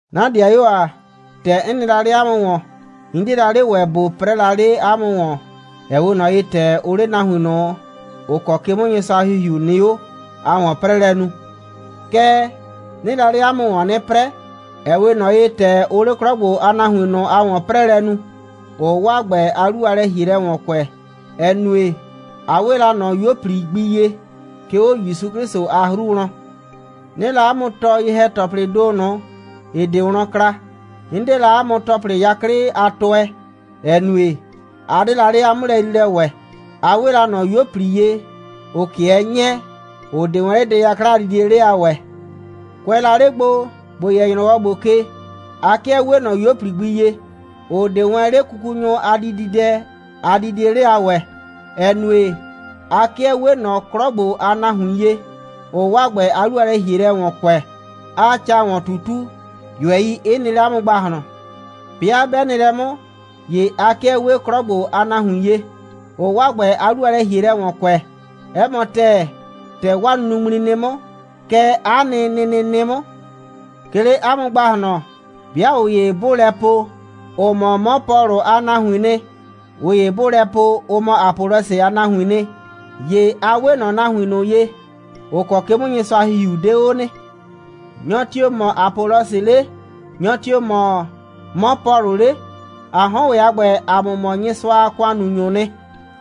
'Na 'dɩayuo ‑a, ‑tɛ 'n nɩ la 'le 'a mʋ ‑wɔn, 'n 'die la 'le ‑wɛ ꞊bo 'prɛɛ la 'le 'a mʋ ‑wɔn, ‑ɛ 'we ꞊nɔ ye, ‑tɛ ʋʋ 'le nahuin ꞊nʋ, ‑ʋ kɔ ke 'mʋ Nyɩsʋa a ‑Hihiu nɩ 'o a ‑wɔn'prɛɛlɛ nu. Kɛɛ, 'nɩɩ la 'le 'a mʋ ‑wɔn 'nɩ 'prɛɛ, ‑ɛ 'we ꞊nɔ ye, ‑tɛ ʋʋ 'le 'klɔ ‑gbo a nahuin ꞊nʋ a ‑wɔn'prɛɛlɛ nu, ‑ʋʋ 'waa ‑gbɛ a 'lu a lɛ‑hielɛ ‑wɔn kʋɛ, ‑ɛ nue, a 'we la ꞊nɔ 'yuo꞊pli gbi ye, 'ke 'o ‑Yusu 'Klɩsʋ a 'hru wlɔn. 'Nɩɩ la 'a mʋ tɔɔ ye‑hɛ‑tɔplɩɩ ‑do ꞊nʋ, ‑ɩ 'de wlɔn kla. 'N 'de la 'a mʋ ‑tɔplɩ 'yaklɩ a tʋɛ, ‑ɛ nue, a 'de la 'le 'a 'mʋlɛyriilɛ ‑wɛ. A 'we la ꞊nɔ 'yuo꞊pli ye, ‑ʋ 'kɩɛ 'nyɛɛ, ‑ʋ 'de wɛn 'le dɛ 'yakla a didie 'le a ‑wɛɛ. Kʋɛ la 'le gbo, ‑bo yɛ ‑nyrɔwɔ ‑gbo ke, a 'kɩɛ 'wee ꞊nɔ 'yuo꞊pli gbi ye, ‑ʋ 'de wɛn 'le kukunyʋ a dididɛ a didie 'le a ‑wɛɛ, ‑ɛ nue, a 'kɩɛ 'wee ꞊nɔ 'klɔ ‑gbo a nahuin ye, ‑ʋʋ 'waa ‑gbɛ a 'lu a lɛ‑hielɛ ‑wɔn kʋɛ, 'aa ca ‑wɔn ꞊tutu, ꞊yʋɛi 'ɩ nɩ 'le 'a mʋ ‑gbahlɔn. 'Bɩa 'bɛ nɩ lɛ 'mʋ, ‑ye a 'kɩɛ 'wee 'klɔ ‑gbo a nahuin ye, ‑ʋʋ 'waa ‑gbɛ a 'lu a lɛ‑hielɛ ‑wɔn kʋɛ. 'Ɛ mɔ ‑tɛɛ, ‑tɛ 'waa nunuŋmli nɩ 'mʋ, kɛ 'a nɩ nɩnɩ nɩ 'mʋ. 'Ke 'le 'a mʋ ‑gbahlɔn, 'bɩa ꞊ʋ ‑ye 'bʋʋ lɛ po, ʋ mɔ 'mɔ Pɔlʋ a nahuiin nɩ, ꞊ʋ ‑ye 'bʋʋ lɛ po, ʋ mɔ Apɔlɔsɩ a nahuiin nɩ, ‑ye a 'we ꞊nɔ nahuin ꞊nʋ ye, ‑ʋ kɔ ke 'mʋ Nyɩsʋa a ‑Hihiu 'de 'o nɩ. Nyɔ tio‑ mɔ Apɔlɔsɩ 'le? Nyɔ tio‑ mɔ 'mɔ Pɔlʋ 'le? ‑A 'hɔn ‑wɛ a ‑gbɛ, ‑a mʋ mɔ Nyɩsʋa a ‑kʋannunyʋʋ nɩ,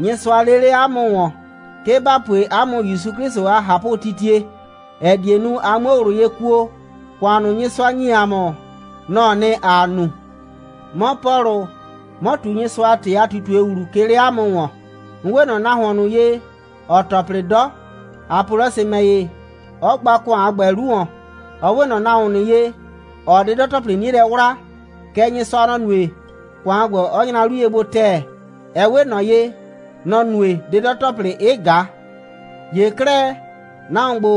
Nyɩsʋa lee 'le 'a mʋ ‑wɔn, 'ke ‑ba pue 'a mʋ ‑Yusu 'Klɩsʋ a ꞊hapʋtitie, ‑ɛ die nu, a 'muo ꞊wlʋ ye kuo. ‑Kʋan ꞊nʋ, Nyɩsʋa ‑nyi ‑a mʋ, nɔ‑ɔ nɩ, ‑aa nu. 'Mɔ Pɔlʋ, 'mɔ ꞊tu Nyɩsʋa a ‑tɩ a ꞊tutue ‑wlu, 'ke 'le 'a mʋ ‑wɔn. 'N 'we ꞊nɔ nahuon ꞊nʋ ye, ‑ɔɔ ‑tɔplɩ 'dɔ; Apɔlɔsɩ ‑mɛ ‑ye, 'ɔ gba ‑kʋan a ‑gbɛ 'lu ‑wɔn. Ɔ 'we ꞊nɔ nahuon ꞊nʋ ye, ‑ɔɔ 'dɩdɔ‑tɔplɩ 'nie lɛ 'wlaa. Kɛɛ, Nyɩsʋa, nɔ‑ nue, ‑kʋan a ‑gbɛ 'ɔ nyra 'lu ye gbo ‑tɛɛ. Ɛ 'we ꞊nɔ ye, nɔ‑ nue, 'dɩdɔ‑tɔplɩ 'ɩ ꞊ga. ‑Ye 'klɛɛ, nahuon ‑gbo,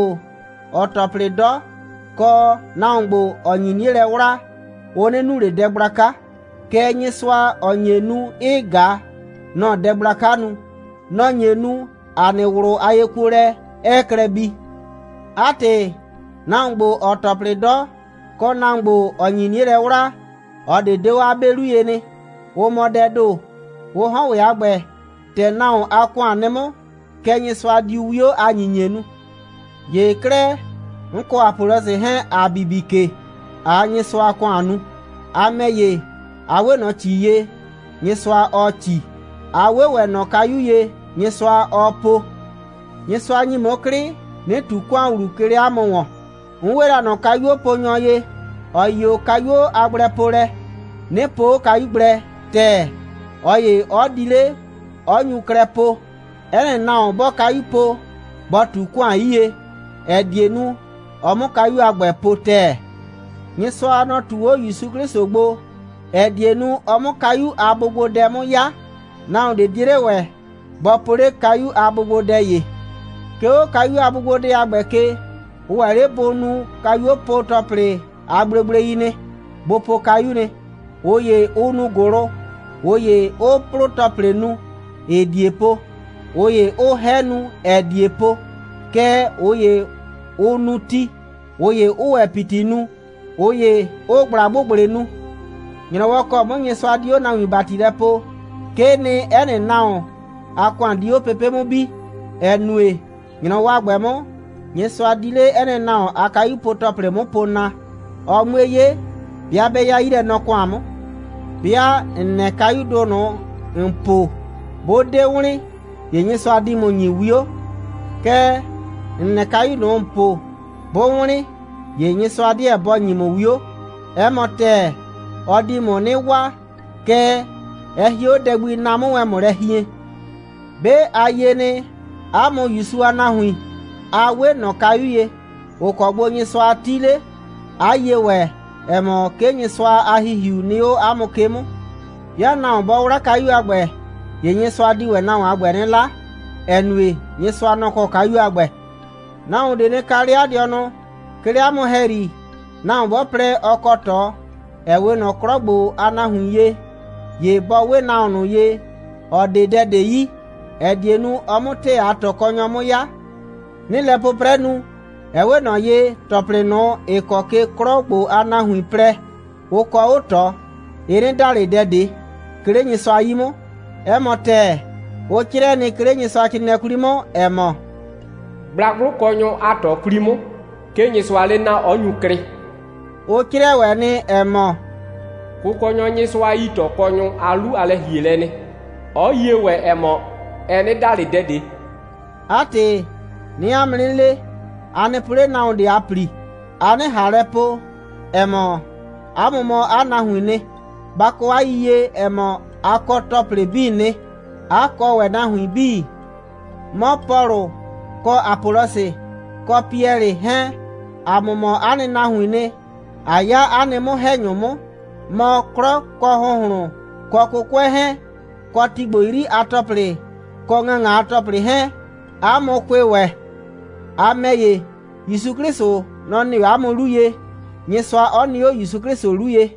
‑ɔɔ ‑tɔplɩ 'dɔ, kɔ nahuon ‑gbo, ‑ɔ nyi 'nie lɛ 'wlaa, ʋ 'nɩ nu ꞊le dɛ gblaka. Kɛɛ, Nyɩsʋa, ‑ɔ nye nu, 'ɩɩ ꞊ga, nɔ‑ɔ dɛ gblaka nu. Nɔ‑ nye nu, 'a nɩ ꞊wlʋ a yekuolɛ 'ɛɛ klɛ bii. 'A ‑tɩ, nahuon ‑gbo, ‑ɔɔ ‑tɔplɩ 'dɔ, kɔ nahuon ‑gbo, ‑ɔ nyi 'nie lɛ 'wlaa, ꞊ɔ ꞊de 'de 'o 'a 'be 'lu ye nɩ. Ʋ mɔ dɛɛ ‑do. Ʋ 'hɔn ‑wɛ a ‑gbɛ, ‑tɛ nahuon a ‑kʋan nɩ 'mʋ, kɛ Nyɩsʋa diu 'wio a ‑nyinyie nu. ‑Ye 'klɛɛ, 'n kɔ Apɔlɔsɩ 'hɛɛn, ‑a bibi ke, ꞊aa Nyɩsʋa a ‑kʋan nu. A ‑mɛ ‑ye, a 'we ꞊nɔ ‑ci ye, Nyɩsʋa, ɔɔ ‑ci. A 'we ‑wɛ ꞊nɔ kayu ye, Nyɩsʋa, ɔɔ po. Nyɩsʋa ‑nyi 'mʋ 'klɩ, 'nɩ ꞊tu ‑kʋan ‑wlu, 'ke 'le 'a mʋ ‑wɔn. 'N 'we la ꞊nɔ kayuoponyɔ ye, ‑ɔ yi 'o kayuo a gblɛpolɛ, 'nɩ po 'o kayu gblɛ ‑tɛɛ, ꞊ɔ ‑ye 'ɔ di 'le, 'ɔ nyu 'klɛɛ po. 'Ɛ nɩ nahuon, 'bɔɔ kayu po, bɔ ꞊tu ‑kʋan 'yie, ‑ɛ die nu, ɔ 'mʋ kayu a ‑gbɛ po ‑tɛɛ. Nyɩsʋa, nɔ‑ ꞊tu 'o ‑Yusu 'Klɩsʋ gbo, ‑ɛ die nu, ɔ 'mʋ kayu a bʋgbodɛ 'mʋ 'ya. Nahuon ꞊de 'die 'le ‑wɛ bɔ po 'le kayu a bʋgbodɛ ‑ye. 'Ke 'o kayu a bʋgbodɛ a ‑gbɛ ke, ʋ ‑wɛ 'le bʋ nu kayupo‑tɔplɩ a gblegblei nɩ, bʋ po kayu nɩ. ꞊Ʋ ‑ye, ʋʋ nu ‑gʋlʋ, ꞊ʋ ‑ye 'ʋʋ 'plʋ‑tɔplɩ nu, ‑ɩɩ ꞊die po, ꞊ʋ ‑ye 'ʋʋ 'hɛ nu, ‑ɛɛ ꞊die po. Kɛɛ, ꞊ʋ ‑ye, ʋʋ nu ti, ꞊ʋ ‑ye 'ʋʋ ‑wɛ ‑piti nu, ꞊ʋ ‑ye 'ʋʋ ꞊gblagbʋgblɩ nu. ‑Nyrɔwɔ ‑kɔ 'mʋ Nyɩsʋa di 'o nahuin ‑bati lɛ poo, 'kee nɩ, 'ɛ nɩ nahuon a ‑kʋan di 'o pepe' 'mʋ bi, ‑ɛ nue, ‑nyrɔwɔ a ‑gbɛ 'mʋ, Nyɩsʋa di 'le 'ɛ nɩ nahuon a kayupo‑tɔplɩ 'mʋ po na, ɔ 'mue 'ye, 'bɩa 'bɛ 'ya 'yilɛnɔ‑kʋan 'mʋ. 'Bɩa ‑n nɛ kayudʋ ꞊nʋ, ‑n po, 'bʋ 'de wlɩn, ‑ye Nyɩsʋa di ‑mʋ ‑nyi 'wio. Kɛɛ, ‑n nɛ kayu ꞊nʋ, ‑n po, 'bʋ wlɩn, ‑ye Nyɩsʋa 'deɛ bɔ ‑nyi ‑mʋ 'wio. 'Ɛ mɔ ‑tɛɛ, ɔ di ‑mʋ 'nɩ waa, kɛɛ, ɛ hie 'o dɛ gbi, na 'mʋ wɛn ‑mʋ lɛ hien. 'Be a yie nɩ, 'a mʋ ‑Yusu a nahuin, a 'we ꞊nɔ kayu ye, ‑ʋ kɔ gbo Nyɩsʋa 'ti 'le, 'a yie ‑wɛ, ‑ɛ mɔ, 'ke Nyɩsʋa a ‑Hihiu nɩ 'o 'a mʋ ke 'mʋ. 'Bɩa nahuon 'bɔ 'wla kayu a ‑gbɛ, ‑ye Nyɩsʋa di ‑wɛ nahuon a ‑gbɛ 'nɩ 'la, ‑ɛ nue, Nyɩsʋa, nɔ‑ kɔ kayu a ‑gbɛ. Nahuon ꞊de nɩ kaa 'le 'a dɩɔnʋ. 'Ke 'le 'a mʋ ‑hɛyri, nahuon 'bɔ plɛ, ɔ kɔ ꞊tɔ, ‑ɛ 'we ꞊nɔ 'klɔ ‑gbo a nahuin ye, ‑ye bɔ 'we nahuon ꞊nʋ ye, ‑ɔ 'de dɛ ꞊de yi, ‑ɛ die nu, ɔ 'mʋ ‑tɛɛ a ꞊tɔkɔnyɔ 'mʋ 'ya. 'Nɩɩ lɛ 'pʋprɛ nu, ɛ 'we ꞊nɔ ye, ‑tɔplɩ ꞊nʋ, ‑ɩ kɔ ke 'klɔ ‑gbo a nahuin plɛ, ʋ kɔ 'o ꞊tɔ, ɩ 'nɩ da ꞊le dɛ ꞊de, 'ke 'le Nyɩsʋa 'yi 'mʋ. 'Ɛ mɔ ‑tɛɛ, ʋ 'crɩɛ nɩ, 'ke 'le Nyɩsʋacrɩɩnɩɛ 'kwli 'mʋ, ‑ɛ mɔ: «Gblagblʋkɔnyʋ a ꞊tɔ 'kwli 'mʋ, 'ke Nyɩsʋaa 'le naa, 'ɔ nyu klɩ.» Ʋ 'crɩɛ ‑wɛ nɩ, ‑ɛ mɔ: «Kʋkɔnyɔ Nyɩsʋa yi ꞊tɔkɔnyʋ a 'lu a lɛ‑hielɛ nɩ, 'ɔ yie ‑wɛ, ‑ɛ mɔ, ɛ 'nɩ da ꞊le dɛ ꞊de.» 'A ‑tɩ, 'nɩɩ 'a mʋ 'nɩ le, a nɩ po 'le nahuon ꞊de a ‑pli, a 'nɩ ꞊han lɛ po, ‑ɛ mɔ, 'a mʋ mɔ 'a nahuiin nɩ. Ba kɔ 'a yiyie, ‑ɛ mɔ, a kɔ ‑tɔplɩ 'bii nɩ, 'a kɔ ‑wɛ nahuin 'bii. 'Mɔ Pɔlʋ, kɔ Apɔlɔsɩ, kɔ Piɛlɩ 'hɛɛn, ‑a mʋ mɔ 'a nɩ nahuiin nɩ, ꞊a 'ya 'a nɩ 'mʋ‑hɛnyʋ 'mʋ. Mɔ, 'klɔ, kɔ ‑hʋnhlʋn, kɔ 'kʋkʋɛ 'hɛɛn, kɔ ti ‑gbo 'yri a ‑tɔplɩ, kɔ ‑ŋaŋa a ‑tɔplɩ 'hɛɛn, 'a mʋ kʋɩ ‑wɛ. A ‑mɛ ‑ye, ‑Yusu 'Klɩsʋ, nɔ‑ nɩ 'o 'a mʋ 'lu ye, Nyɩsʋa 'ɔ nɩ 'o ‑Yusu 'Klɩsʋ 'lu ye.